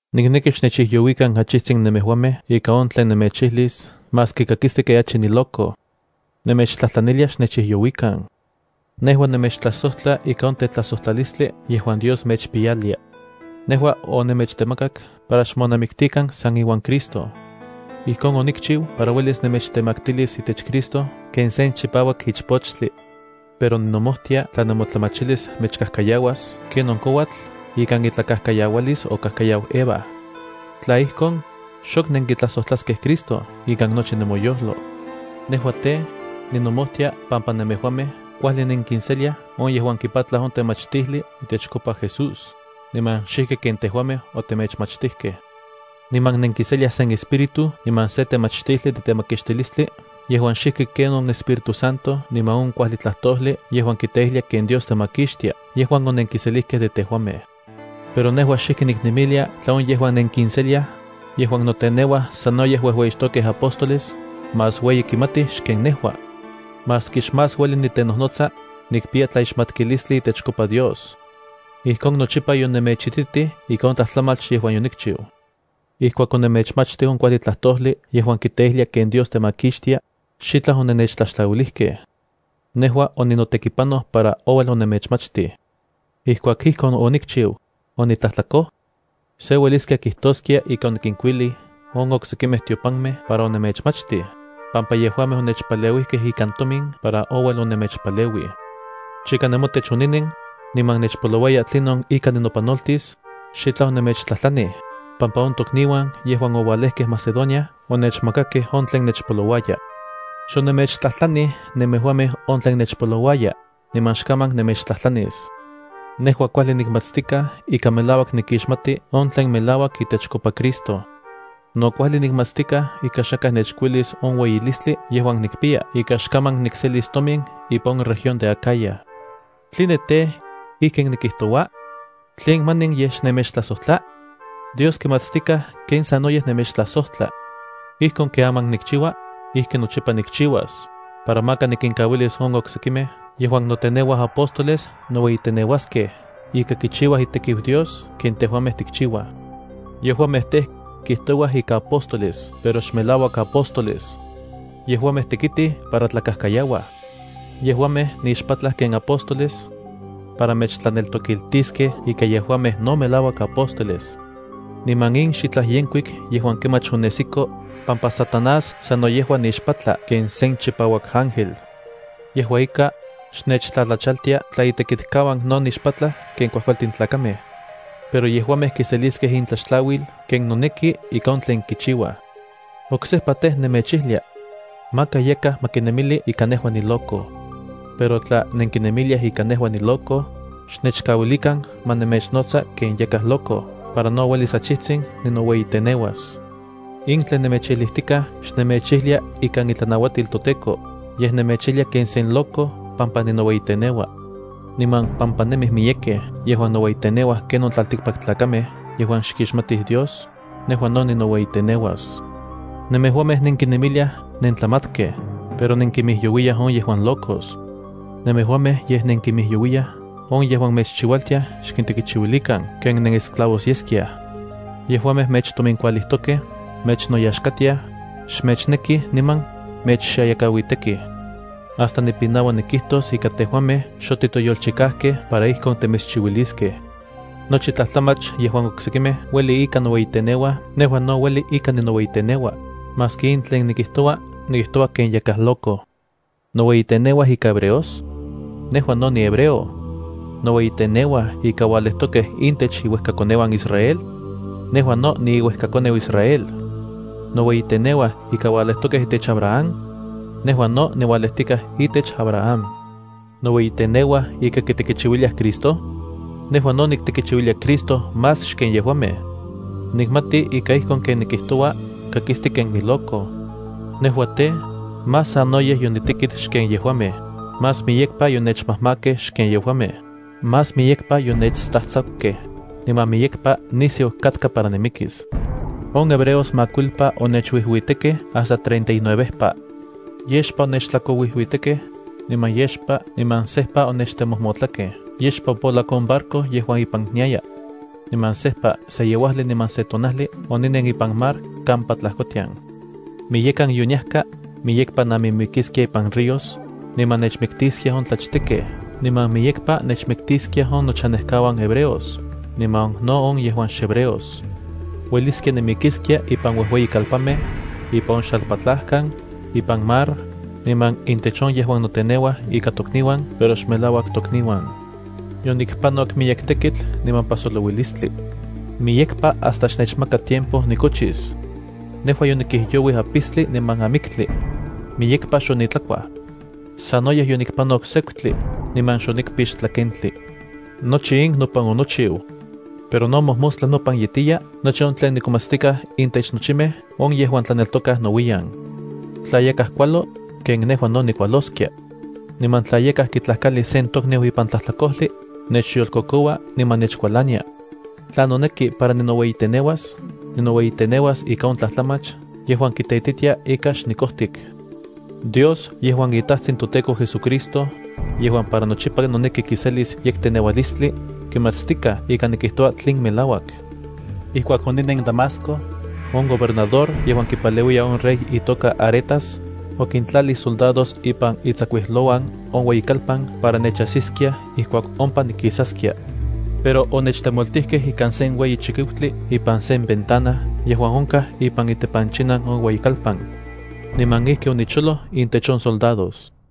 Nikneki xnechijyouikan achijtsin nemejuamej ika on tlen nemechijlis maski kakisti ken achi niloco. Nemechtlajtlanilia, xnechijyouikan. Nejua nemechtlajsojtla ika on tetlajsojtlalistli yejuan Dios mechpiyalia. Nejua onemechtemakak para xmonamiktikan san iuan Cristo. Ijkon onikchiu para uelis nemechtemaktilis itech Cristo ken sen chipauak ichpochtli. Pero ninomojtia tla nemotlamachilis mechkajkayauas ken on kouatl ikan itlakajkayaualis okajkayau Eva. Tla ijkon, xok nenkitlajsojtlaskej Cristo ikan nochi nemoyojlo. Nejua tej, ninomojtia pampa nemejuamej kuajli nenkinseliaj on yejuan kipatlaj on temachtijli itechkopa Jesús, niman xijki ken tejuamej otemachtijkej. Niman nenkiseliaj sen espíritu niman sen temachtijli de temakixtilistli yejuan xijki ken on Espíritu Santo niman on kuajli tlajtojli yejuan kiteijlia ken Dios temakixtia yejuan onenkiselijkej de tejuamej. Pero nejua xijki niknemilia ika on yejuan nenkinseliaj, yejuan noteneuaj sanoyej uejueyixtokej apóstoles, más ueyi kimatij xken nejua. Maski xmás ueli nitenojnotsa, nikpiya tlaixmatkilistli itechkopa Dios. Ijkon nochipa yonemechititij ika on tlajtlamach yejuan yonikchiu. Ijkuak onemechmachtij on kuajli tlajtojli yejuan kiteijlia ken Dios temakixtia, xitlaj onennechtlaxtlauilijkej. Nejua oninotekipanoj para ouel onemechmachitij. Ijkuak ijkon onikchiu, ¿onitlajtlakoj? Se ueliskia kijtoskia ika onikinkuilij on oksekimej tiopanmej para onemechmachtij, pampa yejuamej onechpaleuijkej ikan tomin para ouel onemechpaleuij. Chika nemotech oninen, niman nechpolouaya tlinon ika ninopanoltis, xitlaj onemechtlajtlanij, pampa on tokniuan yejuan oualejkej Macedonia onechmakakej on tlen nechpolouaya. Xonemechtlajtlanij nemejuamej on tlen nechpolouaya, niman xkaman nemechtlajtlanis. Nejua kuajli nikmatstikaj ika melauak nikixmati on tlen melauak itechkopa Cristo. No kuajli nikmatsitikaj ika xakaj nechkuilis on ueyilistli yejuan nikpiya ika xkaman nikselis tomin ipan on región de Acaya. ¿Tline tej, ijkin nikijtoua? ¿Tlen manin yej xnemechtlajsojtla? Dios kimatstikaj ken sanoyej nemechtlajsojtla. Ijkon ken aman nikchiua, ijki nochipa nikchiuas, para maka nikinkauilis on oksekimej yejuan noteneuaj apóstoles noueyiteneuaskej ika kichiuaj itekiu Dios ken tejuamej tikchiuaj. Yejuamej tej, kijtouaj ika apóstoles pero xmelauak apóstoles. Yejuamej tekitij para tlakajkayauaj. Yejuamej nixpatlaj ken apóstoles para mechtlaneltokiltiskej ika yejuamej no melauak apóstoles. Niman in xitlaj yenkuik kemach onesiko, pampa Satanás sano yejua nixpatla ken sen chipauak ángel. Yejua ika, xnechtlatlachaltia tla itekitkauan no nixpatlaj ken kuajkualtin tlakamej. Pero yejuamej kiseliskej intlaxtlauil ken noneki ika on tlen kichiuaj. Oksejpa tej, nemechijlia: maka yakaj ma kinemili ika nejua niloco. Pero tla nenkinemiliaj ika nejua niloco, xnechkauilikan ma nemechnotsa ken yakaj loco para no uelis achijtsin ninoueyiteneuas. In tlen nemechijlijtikaj xnemechijlia ikan itlanauatil toTEKO, yej nemechijlia ken sen loco, pampa ninoueyiteneua. Niman pampa nemij miyekej yejuan noueyiteneuaj ken on tlaltikpaktlakamej yejuan xkixmatij Dios, nejua no ninoueyiteneuas. Nemejuamej nenkinemiliaj nentlamatkej, pero nenkinmijyouiyaj on yejuan locos. Nemejuamej yej nenkinmijyouiyaj on yejuan mechchiualtiaj xkintekichiuilikan ken nenesclavos yeskiaj. Yejuamej mechtominkualijtokej, mechnoyaxkatiaj, xmechnekij, niman mechxayakauitekij. Hasta nipinaua nikijtos ika tejuamej xotitoyolchikajkej para ijkon temechchiuiliskej. Nochi tlajtlamach yejuan oksekimej ueli ika noueyiteneuaj, nejua no ueli ika ninoueyiteneua, maski in tlen nikijtoua nikijtoua ken yakaj loco. ¿Noueyiteneuaj ika hebreos? Nejua no nihebreo. ¿Noueyiteneuaj ika ualejtokej intech iuejkakoneuan Israel? Nejua no niiuejkakoneu Israel. ¿Noueyiteneuaj ika ualejtokej itech Abraham? Nejua no niualejtikaj itech Abraham. ¿Noueyiteneuaj ika kitekichiuiliaj Cristo? Nejua no niktekichiuilia Cristo más xken yejuamej. (Nikmati ika ijkon ken nikijtoua, kakisti ken niloco.) Nejua tej, más sanoyej yonitekit xken yejuamej, más miyekpa yonechmajmakej xken yejuamej, más miyekpa yonechtsajtsakukej, niman miyekpa nisiu katka para nimikis. On hebreos makuilpa onechuijuitekej hasta treinta y nuevejpa. Yexpa onechtlakouijuitekej, niman sejpa onechtemojmotlakej. Yexpa opolak on barco yejuan ipan niaya. Niman sejpa se yeuajli niman se tonajli oninen ipan mar kampa tlajkotian. Miyekan yoniajkaj, miyekpa namimikiskia ipan ríos, niman nechmiktiskiaj on tlachtekkej. Niman miyekpa nechmiktiskiaj on nochannekauan hebreos, niman no on yejuan xhebreos. Ueliskia nimikiskia ipan uejueyikalpanmej, ipan on xalpatlajkan, ipan mar, niman intech on yejuan noteneuaj ika tokniuan pero xmelauak tokniuan. Yonikpanok miyek tekitl niman pajsolouilistli. Miyekpa hasta xnechmaka tiempo nikochis. Nejua yonikijyouij apistli niman amiktli. Miyekpa xonitlakuaj. Sanoyej yonikpanok sekutli, niman xonikpix tlakentli. Nochi in nopan onochiu. Pero no mojmostla nopan yetiya nochi on tlen nikomatstikaj intech nochimej on yejuan tlaneltokaj nouiyan. Tla yakaj kualo, ken nejua no nikualoskia. Niman tla yakaj kitlajkali sen tokniu ipan tlajtlakojli, nechyolkokoua niman nechkualania. Tla noneki para ninoueyiteneuas, ninoueyiteneuas ika on tlajtlamach yejuan kiteititiaj ika xnikojtik. Dios yejuan iTajtsin toTEKO JesuCristo, yejuan para nochipa noneki kiselis yekteneualistli, kimatstikaj ika nikijtoua tlen melauak. Ijkuak oninen Damasco, on gobernador, yejuan kipaleuiya on rey itoka Aretas, okintlalij soldados ipan itsakuijlouan on ueyikalpan para nechajsiskiaj ijkuak ompa nikisaskia. Pero onechtemoltijkej ikan sen ueyi chikiutli ipan sen ventana yejuan onkaj ipan itepanchinan on ueyikalpan. Niman ijki onicholoj intech on soldados.